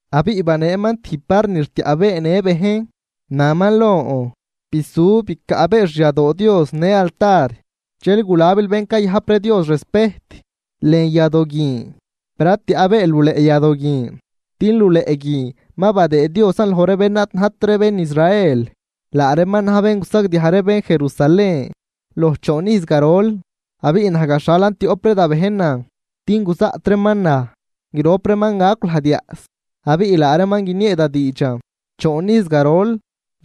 Abiꞌ baneeman tijb var ni rtiaꞌbeenë bejn, naman lon: ―Bisu bicaꞌbee xyadoo Dios në altar, dxel gulabil bén cayajp ree Dios respejt lën yadoo guin. Per ad tiaꞌbeel luleꞌ yadoo guin din luleꞌ guin ma badëë Diosan loj ree bén ad najt ree bén Israel, laa reeman na̱j bén gusagdiaj ree bén Jerusalén loj choon ijz garol. Abiꞌ naj gaxhalan tioꞌp ree da bejnan din guzaꞌt reeman naj. Grop reeman gacw lajd yaꞌs, abiꞌ laa reeman guiniee da diidxan choon ijz garol.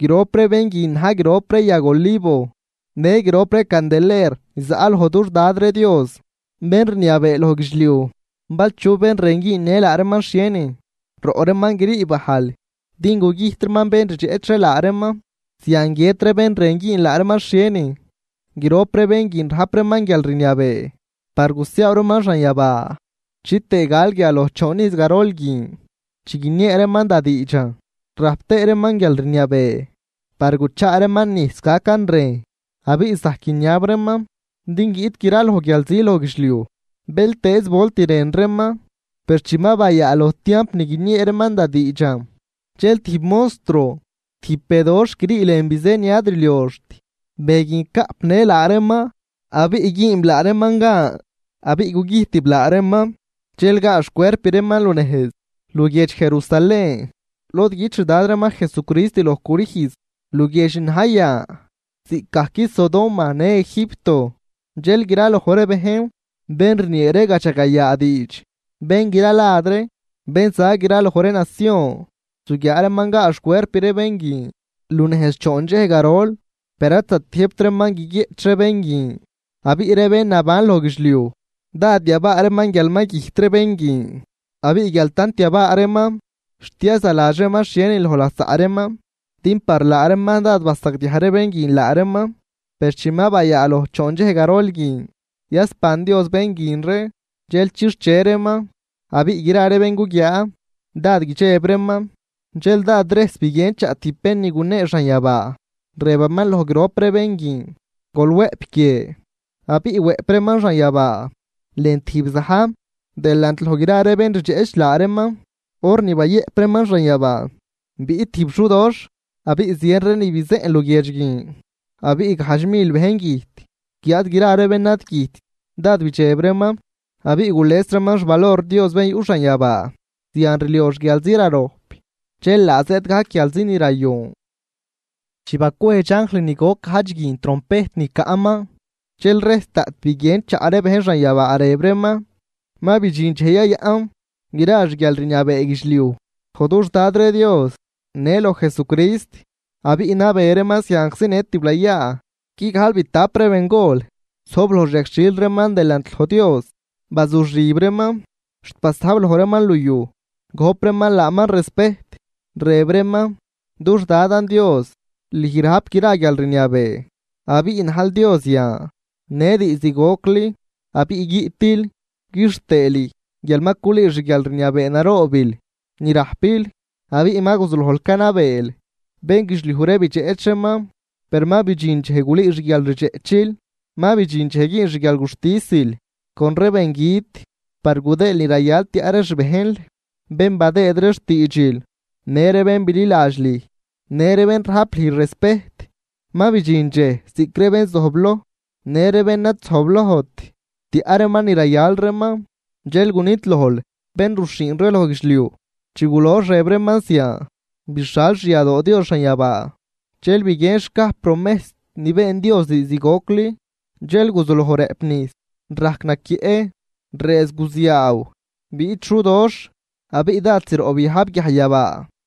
Grop ree bén guin na̱j grop ree yag olivo në grop ree candeler ni zaꞌ loj dux Dad ree Dios bén rniabee loj guidxliuj. Bal chu bén rën güünnë laa reeman xhienin, roꞌ reeman grii bajl din gugüjt reeman bén rdxeꞌch ree laa reeman. Zian guiët ree bén rën güün laa reeman xhienin. Grop ree bén guin rajp reeman guialrniabee par gusiaaw reeman xanyabaa chitëë gal guia loj choon ijz garol guin chi guiniee reeman da diidxan. Rajp tëë reeman guialrniabee par guchaa reeman nijs gacan rejn, abiꞌ zajc guiniab reeman din guiꞌt graloj guialzi loj guidxliuj bëltëëz volt rën reeman. Per chi ma bayaaloj tiamp ni guiniee reeman da diidxan, dxel tijb monstruo, tijb be doxh grii lën bizë ni ad rlioxt, be guin caꞌpnë laa reeman abiꞌ güünb laa reeman gan abiꞌ gugüjtib laa reeman. Dxel gaa xcuerp reeman lunejz luguiedx Jerusalén lod güt xdad reeman Jesucrist loj crüjz, luguiedx ni na̱j yan ziꞌcgajc Sodoma në Egipto. Dxel graloj ree bejn bén rniee ree gadxagayaa diidx, bén gralad ree, bén za graloj ree nacion zuguiaa reeman gaa xcuerp ree bén guin lunejz choon dxej garol, per ad zatiëjbt reeman guiguieꞌch ree bén guin. Abiꞌ ree bén naban loj guidxliuj dád yabaa reeman guial ma güjt ree bén guin, abiꞌ guial tant yabaa reeman xt yazaladx reeman xhie renin loj lasaꞌ reeman, din par laa reeman dád basagdiaj ree bén guin laa reeman. Per chi ma bayaaloj choon dxej garol guin, yasban Dios bén guin ree dxel chixche reeman abiꞌ gra ree bén guguiaa dád guidxeb reeman. Dxel dád rejs biguien chaꞌ tijb bén ni gunee xanyabaa, rëbaman loj grop ree bén guin: ―Gol wëꞌp guie. Abiꞌ wëꞌp reeman xanyabaa lën tijb za̱j delant loj gra ree bén rdxeꞌch laa reeman. Hor ni bayëꞌp reeman xanyabaa biꞌt tijb xudoxh abiꞌ zien ree ni bizeꞌn luguiedx guin abiꞌ gajdx mil bejn güjt. Guiáad gra ree bén ad güjtt dád bidxeb reeman abiꞌ gules reeman xvalor Dios bén yuꞌ xanyabaa. Zian rliox guialzi rarojp, dxel laa zëëd gajc guialzi ni rayon. Chi bacwejdx anjl ni goc gajdx guin trompejt ni caꞌman, dxel rejs daꞌt biguien chaꞌ ree bejn xanyabaa rëb reeman: Ma bidxin dxej yayaꞌn gra xguialrniabee guidxliuj loj dux Dad ree Dios në loj Jesucrist abiꞌ nabee reeman zianczi në tiblayaa. Guigajlbitap ree bengol zojb loj xyagxhil reeman delant loj Dios, bazuxib reeman xt basajb loj reeman liuj gojp reeman laaman respejt, rëb reeman: Dux Dadan Dios, lüj rajp gra guialrniabee abiꞌ najl Dios yan në diizd gocli abiꞌ guiꞌtil. Quixtëë lüj guial ma culüü xguialrniabee naroobil ni rajpil abiꞌ ma guzulojl canabeel. Bénguidxliuj ree bidxeꞌch reeman, per ma bidxin dxej gulüü xguialrdxeꞌchil. Ma bidxin dxej güün xguialguxtisil con ree bengüt par gudëël ni rayal tiaꞌ ree xbejnl bén badëëd ree xtiidxil, në ree bén bililadx lüj. Në ree bén rajp lüj respejt. Ma bidxin dxej ziꞌc ree benzojbloj në ree bén ad zojblojt tiaꞌ reeman ni rayal reeman, dxel gunidlojl bén ruxhiin ree loj guidxliuj. Chi gulox rëb reeman zian, bixal xyadoo Dios xanyabaa dxel biguien xcaj promejs ni been Dios diizd gocli. Dxel guzuloj rëꞌp nijs, rajc naquieꞌ, rëëz guziaaw, biꞌt xudoꞌxh abiꞌ dád zroꞌ biajb guiajyabaa.